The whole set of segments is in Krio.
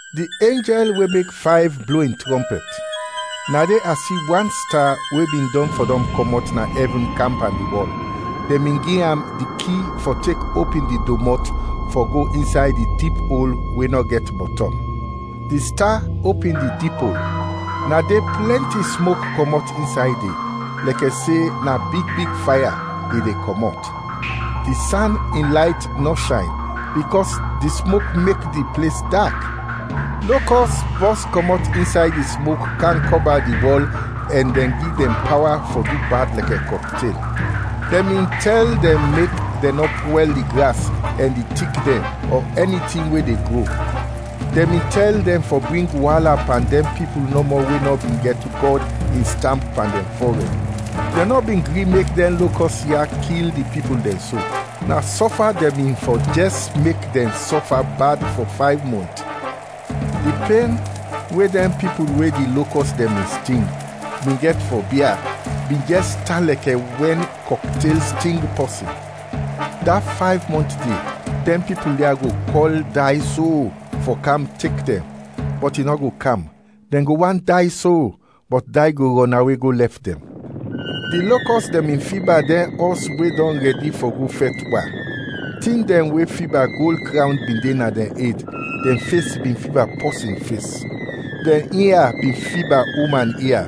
Di enjɛl we mek fayv blo in trɔmpɛt. Na de a si wan sta we bin dɔn fɔdɔm kɔmɔt na ɛvin kam pan di wɔl; dɛn bin gi am di ki fɔ tek opin di domɔt fɔ go insay di dip ol we nɔ gɛt bɔtɔm. Di sta opin di dip ol, na de plɛnti smok kɔmɔt insay de, lɛkɛ se na big big faya i de kɔmɔt; di san in layt nɔ shayn, bikɔs di smok mek di ples dak. Lokɔs bɔs kɔmɔt insay di smok kam kɔba di wɔl ɛn dɛn gi dɛn pawa fɔ du bad lɛkɛ kɔktel. Dɛn bin tɛl dɛn mek dɛn nɔ pwɛl di gras ɛn di tik dɛn ɔ ɛni tin we de gro; dɛn bin tɛl dɛn fɔ bring waala pan dɛn pipul nɔmɔ we nɔ bin gɛt Gɔd in stamp pan dɛn fɔrɛd. Dɛn nɔ bin gri mek dɛn lokɔs ya kil di pipul dɛn so, na sɔfa dɛn bin fɔ jɛs mek dɛn sɔfa bad fɔ fayv mɔnt. Di pen, we dɛn pipul we di lokɔs dɛn bin sting, bin gɛt fɔ bia, bin jɛs tan lɛkɛ wɛn kɔktel sting pɔsin. Da fayv mɔnt de, dɛn pipul ya go kɔl day so fɔ kam tek dɛn, bɔt i nɔ go kam; dɛn go want day so, bɔt day go rɔnawe go lɛf dɛn. Di lokɔs dɛn bin fiba dɛn ɔs we dɔn rɛdi fɔ go fɛt wa; tin dɛn we fiba gold krawn bin de na dɛn ed, dɛn fes bin fiba pɔsin fes. Dɛn ia bin fiba uman ia,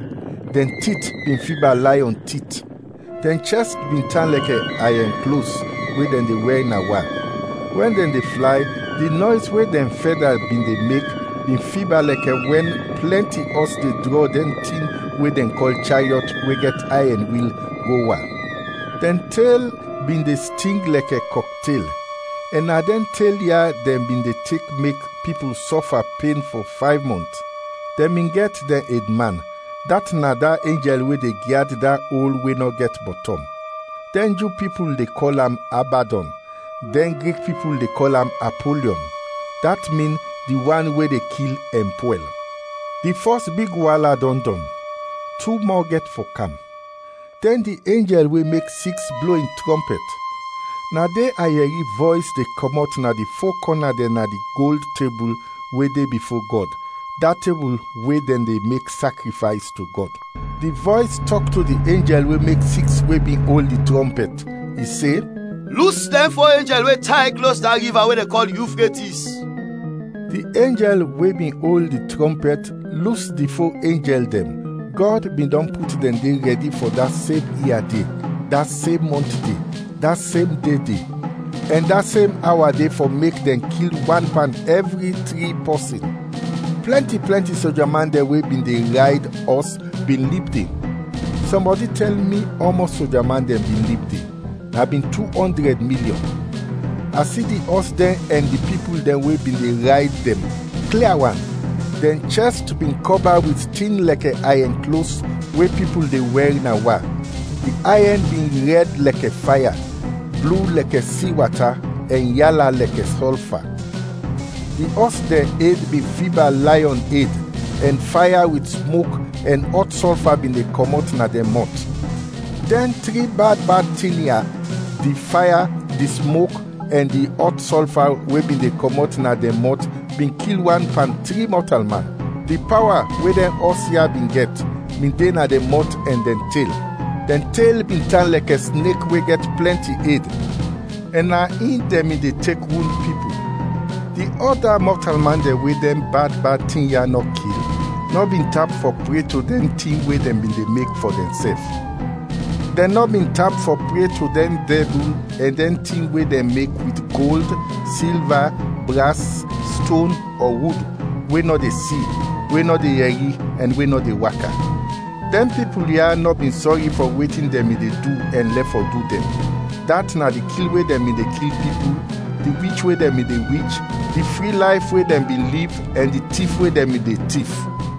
dɛn tit bin fiba layɔn tit. Dɛn chɛst bin tan lɛkɛ ayɛn klos we dɛn de wɛr na wa, wɛn dɛn de flay di nɔys we dɛn fɛda bin de mek bin fiba lɛkɛ wɛn plɛnti ɔs de drɔ dɛn tin we dɛn kɔl chariɔt we gɛt ayɛn wil, go wa. Dɛn tel bin de sting lɛkɛ kɔktel, ɛn na dɛn tel ya dɛn bin de tek mek pipul sɔfa pen fɔ fayv mɔnt. Dɛn bin gɛt dɛn edman, dat na da enjɛl we de gyad da ol we nɔ gɛt bɔtɔm. Dɛn Ju pipul de kɔl am Abadɔn, dɛn Grik pipul de kɔl am Apolyɔn (dat min, “Di wan we de kil ɛn pwɛl”.) Di fɔs big waala dɔn dɔn; tu mɔ gɛt fɔ kam. Dɛn di enjɛl we mek siks blo in trɔmpɛt. Na de a yɛri vɔys de kɔmɔt na di fo kɔna dɛn na di gold tebul we de bifo Gɔd, da tebul we dɛn de mek sakrifays to Gɔd. Di vɔys tɔk to di enjɛl we mek siks we bin ol di trɔmpɛt, i se, “Lus dɛn fo enjɛl we tay klos da riva we dɛn kɔl Yufretis!” Di enjɛl we bin ol di trɔmpɛt lus di fo enjɛl dɛn; Gɔd bin dɔn put dɛn de rɛdi fɔ da sem ia de, da sem mɔnt de, da sem de de, ɛn da sem awa de fɔ mek dɛn kil wan pan ɛvri tri pɔsin. Plɛnti plɛnti soja man dɛn we bin de rayd ɔs bin lib de. Sɔmbɔdi tɛl mi ɔmɔs soja man dɛn bin lib de; na bin tu ɔndrɛd milyɔn. A si di ɔs dɛn ɛn di pipul dɛn we bin de rayd dɛn, klia wan: dɛn chɛst bin kɔba wit tin lɛkɛ ayɛn klos we pipul de wɛr na wa, di ayɛn bin rɛd lɛkɛ faya, blu lɛkɛ si wata, ɛn yala lɛkɛ sɔlfa. Di ɔs dɛn ed bin fiba layɔn ed, ɛn faya wit smok ɛn ɔt sɔlfa bin de kɔmɔt na dɛn mɔt. Dɛn tri bad bad tin ya: di faya, di smok ɛn di ɔt sɔlfa we bin de kɔmɔt na dɛn mɔt bin kil wan pan tri mɔtalman. Di pawa we dɛn ɔs ya bin gɛt, bin de na dɛn mɔt ɛn dɛn tel. Dɛn tel bin tan lɛkɛ snek we gɛt plɛnti ed, ɛn na in dɛn bin de tek wund pipul. Di ɔda mɔtalman dɛn we dɛn bad bad tin ya nɔ kil, nɔ bin tap fɔ pre to dɛn tin we dɛn bin mek fɔ dɛnsɛf. Dɛn nɔ bin tap fɔ pre to dɛn dɛbul ɛn dɛn tin we dɛn mek wit gold, silva, bras, ston ɔ wud, we nɔ de si, we nɔ de yɛri ɛn we nɔ de waka. Dɛn pipul ya nɔ bin sɔri fɔ wetin dɛn bin de du ɛn lɛf fɔ du dɛn, dat na di kil we dɛn bin de kil pipul, di wich we dɛn bin de wich, di fri layf we dɛn bin liv ɛn di tif we dɛn bin de tif.